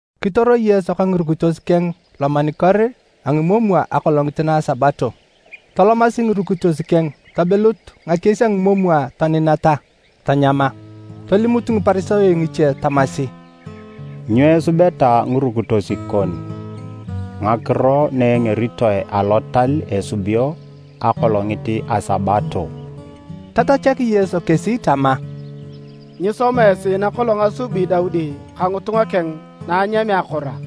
Kitoro Yesu ka ngirukitos keng lomanikor a ngimomwa akolongit na a Sabato. Tolomasi ngirukitos keng tobilut ngakies a ngimomwa toninata, tanyama. Tolimut Ngiparisayo ngiche tamasi, “Nyo esubeta ngirukitos kon ngakiro na engeritoe alotal esubio akolongit na a Sabato?” Tatachak Yesu kesi tama, “Nyisoma esi nakolong asubi Daudi ka ngitunga keng na anyamea akoro a?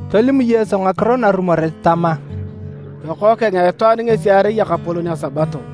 Tolim Yesu ngakiro narumoret tama, “Lokookeng a Itwaan ngesi erai Ekapolon a Sabato.”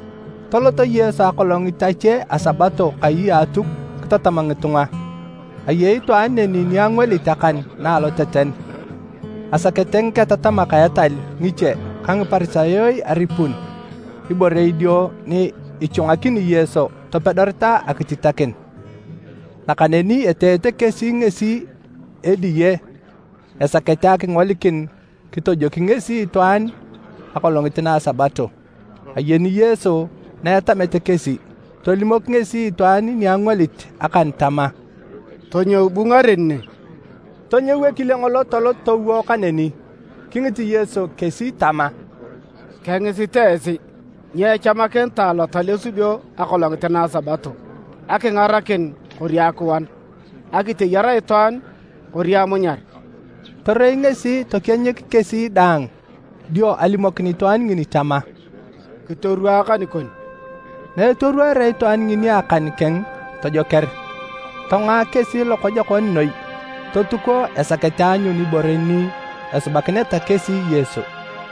Tolot Yesu akolongit ache a Sabato kai a Atuk kitatam ngitunga. Ayei itwaan neni ni angwalit akan na aloteten. Asakete ngiketatamak a etal ngiche ka Ngiparisayo aripun ibore idio ni ichwangakini Yesu topedoreta akititakin, nakaneni eteete kesi ngesi ediye esakete akingolikin kitojoki ngesi itwaan akolongit na a Sabato. Ayeni Yesu na etamete kesi, tolimok ngesi itwaan ni angwalit akan tama, “Tonyou bu ngaren ne. Tonyou ekile ngolo tolot towo kaneni.” Kingit Yesu kesi tama, “Kengisit esi: nyo echamakinitae alotal esubio akolongit na a Sabato? Akingarakin kori akiwan? Akiteyar itwaan kori amunyar?” Torei ngesi tokienyik kesi daang dio alimokin itwaan ngini tama, “Kitorwaa akan kon.” Na etorwaarea itwaan ngini akan keng, tojoker. Tongoa kesi lokojokon noi, totuko esakete aanyun ibore ni esubakineta kesi Yesu.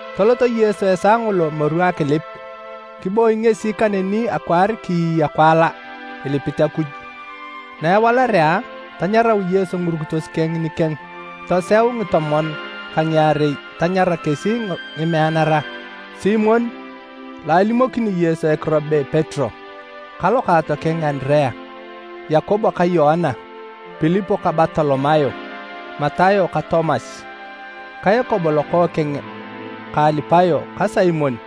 Tolot Yesu esaa ngolo moru akilip, kiboi ngesi kaneni akwaar kiiya kiwala, ilipit Akuj. Na ewalarea, tanyarau Yesu ngirukitos keng nikeng, toseu ngitomon ka ngiarei tanyara kesi ngimeanara: Simon, (lo alimokini Yesu ekiro be Petero) ka lokaatokeng Andirea, Yakobo ka Yoana, Pilip ka Bartolomayo, Matayo ka Tomas, ka Yakobo lokookeng ka Alipayo ka Simon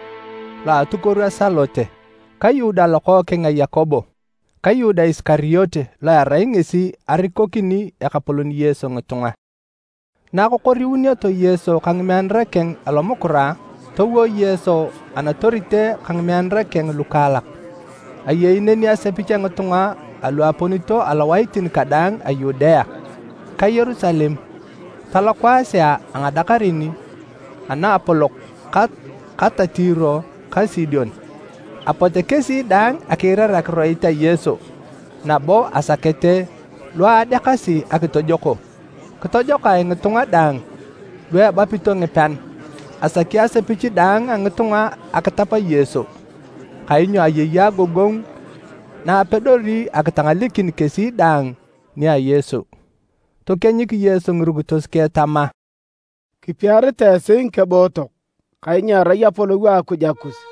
(lo a atukuoru a Salote), ka Yuda lokookeng a Yakobo ka Yuda Isikariote lo erai ngesi arikokini Ekapolon Yesu ngitunga. Na akokoriunioto Yesu ka ngimeanara keng alomukura, towo Yesu anatorite ka ngimeanara keng lukaalak. Ayei neni asepich a ngitunga alu aponito alowaitin kadaang a Yudea, ka Yerusalem ta lokwaasea a ngadakarin a naapolok ka ta Tiro ka Sidon, apote kesi daang akiirar akiroit a Yesu nabo asakete lu adeakasi akitojoko. Kitojokae ngitunga daang lu ebapito ngipean. Asaki asepich daang a ngitunga akitap Yesu, kainyo ayei agogongu na apedori akitangalekin kesi daang nia Yesu. Tokienyik Yesu ngirukitos keng tama, “Kipiaritae esi ngikebootok; kainyo erai apolou a Akuj akus!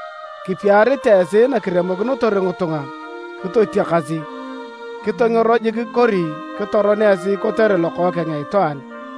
“Kipiaritae esi nakiremokinotor ngitunga kitotiakasi, kitongero jik kori kitoron esi kotere Lokookeng a Itwaan!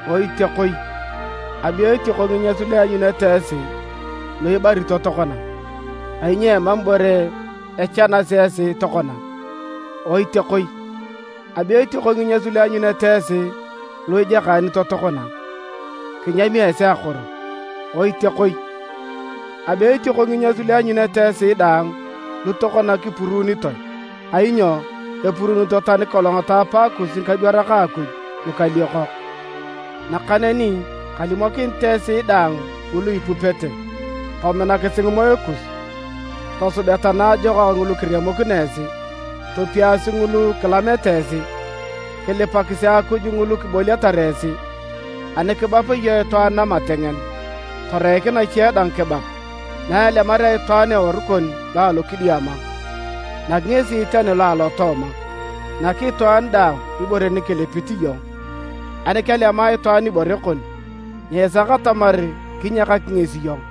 “Oitiakoi! Abe etioko nginyas lu ianyunete esi lu ibarito tokona, kainyo emam ibore echanasi esi tokona. Oitiakoi! Abe etioko nginyas lu ianyunete esi lu ijakaanito tokona, kinyami esi akoro! “Oitiakoi! Abe etioko nginyas lu ianyunete esi daang lu tokona kipuruunitoe, kainyo epuruunito tani kolong taapakus ngikadwarak a Akuj lukaliokok. “Nakaneni kalimokinit esi daang ngulu kipupete, tominakisi ngimoe kus, tosubeta naajokak ngulu kiremokino esi. Topiasi ngulu kilamete esi, kilipakisi Akuj ngulu kiboliatar esi. Ani kibap iyong itwaan namatengen, toreik nache dang kibap, na elemarea itwaan eworu kon lo alokidiama, nak ngesi tani lo alotooma. Nak itwaan daang ibore ni kilipit iyong, ani kelema itwaan ibore kon, nyiisak atamar kinyakak ngesi iyong.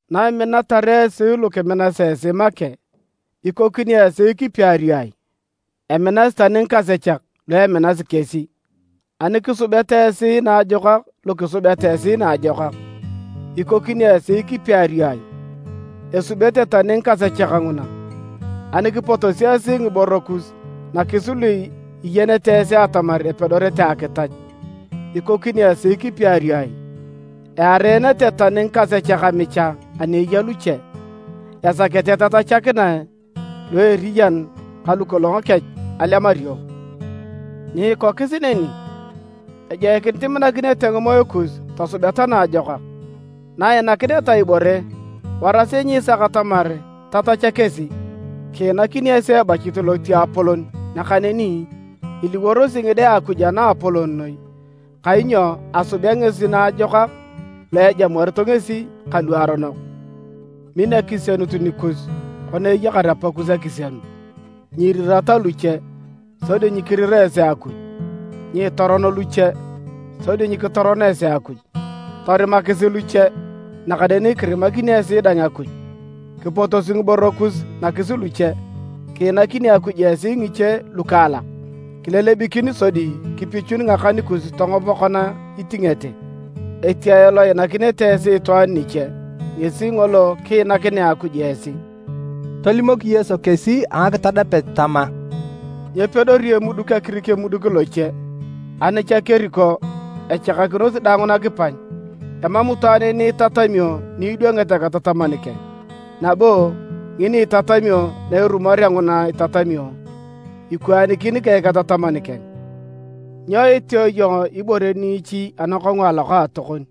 “Naiminatar esi lu kiminasi esi make, ikokinio esi kipiario ai? Eminasi tani ngikasechak lu eminasi kesi! Ani kisubeta esi naajokak lu kisubeta esi naajokak, ikokinio esi kipiario ai? Esubete tani ngikasechak nguna! Ani kipotosi esi ngiboro kus nakis lu iyenete esi atamar epedorete akitach, ikokinio esi kipiario ai? Eareenete tani ngikasechak amicha ani eya luche, esakete tatachakinae lu eriyan ka lukolong kech alemario! Nyiikokis neni, ejoikinit iminakinete ngimoe kus tosubeta naajokak, na iinakineta ibore warasi nyiisaka atamar tatacha kesi. Kiinakini esi ebachit lotiapolon nakaneni iliworosi ngide a Akuj a Naapolon Noi, kainyo asubea ngesi naajokak lu ejamuarito ngesi ka luaronok. Min akisienut nikus kona eyakar Apakus akisienut. “Nyiirirata luche, sodi nyikirira esi Akuj. Nyiitoron luche, sodi nyikitoron esi Akuj. Torimakisi luche, nakaneni kirimakini esi dang Akuj. Kipotosi ngiboro kus nakis luche, kiinakini Akuj esi ngiche lukokaalak, kilelebikin sodi kipichun ngakan kus tongop kona itingete. Etiae lo iinakinete esi itwaan niche, ngesi ngolo kiinakinea Akuj esi.” Tolimok Yesu kesi a ngakitadapet tama, “Nyepedori emuduk akirik emuduk loche, ani cha keriko echakakinosi daang nakipany. Emam itwaan ni itatamio ni idwangit eketataman keng, nabo ngini itatamio na erumorea nguna itatamio, ikwaanikin ka eketataman keng. “Nyo iteeo iyong ibore niichi anakongu alokaatokon,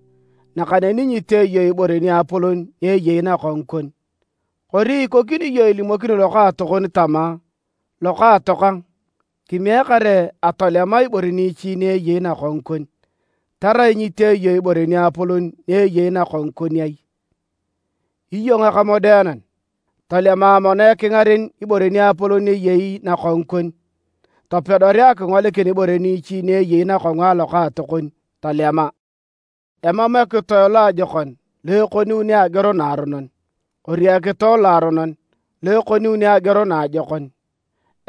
nakaneni nyitee iyong ibore niapolon ni eyei nakongu kon? Kori ikokini iyong ilimokini lokaatokon tama, ‘Lokaatokang, kimiek kare atolema ibore niichi ni eyei nakongu kon,’ tarai nyitee iyong ibore niapolon ni eyei nakongu kon ai? Iyong ekamodeanan! Tolema mono ekingaren ibore niapolon ni eyei nakongu kon, topedorea akingolikin ibore niichi ni eyei nakongu alokaatokon tolema. “Emam ekitoe loajokon lo ekoniuni ageor naaronon, kori ekitoe loaronon lo ekoniuni ageor naajokon.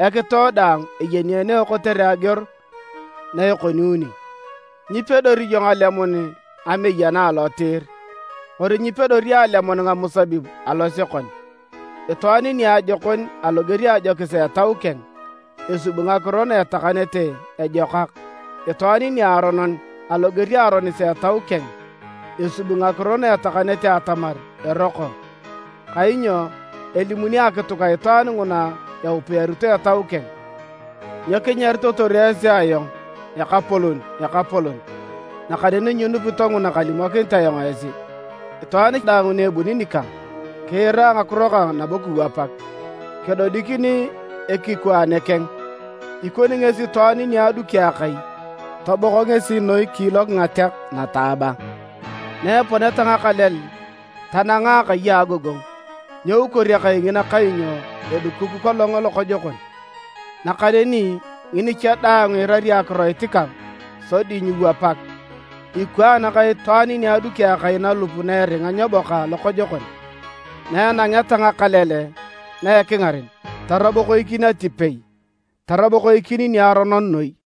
Ekitoe daang eyeneeneo kotere ageor na ekoniuni, nyipedori iyong alemun ngameyana alotiir, kori nyipedori alemun ngamusabib alosekon. Itwaan niajokon aloger a ajokis a etau keng, esubi ngakiro na etakanete ejokak. Itwaan niaronon aloger a aronis a etau keng esubi ngakiro na etakanete atamar eroko, kainyo elimuni akituk a itwaan nguna eupiarito etau keng. “Nyo kinyaritotor esi ayong, ‘Ekapolon, Ekapolon’, nakaneni nyinupito nguna kalimokinit ayong esi? Itwaan daang ni ebuni nikang, kiira ngakiro kang nabo kiwapak, kedodikini ekikwaane keng. Ikoni ngesi itwaan ni aduki akai, tobok ngesi noi kiilok ngateak lokojokon. Na eponeta ngakalel tananga akai a agogongu, nyeukor akai ngina kainyo edukuk kolong lokojokon. Nakaneni ngini cha daang iirari akiroit kang sodi nyiiwapak, ikwaan ka itwaan ni aduki akai nalup na eringa nyeboka lokojokon. Na anangeta ngakalel na ekingaren tarabokoikin atipei, tarabokoikin niaronon noi!”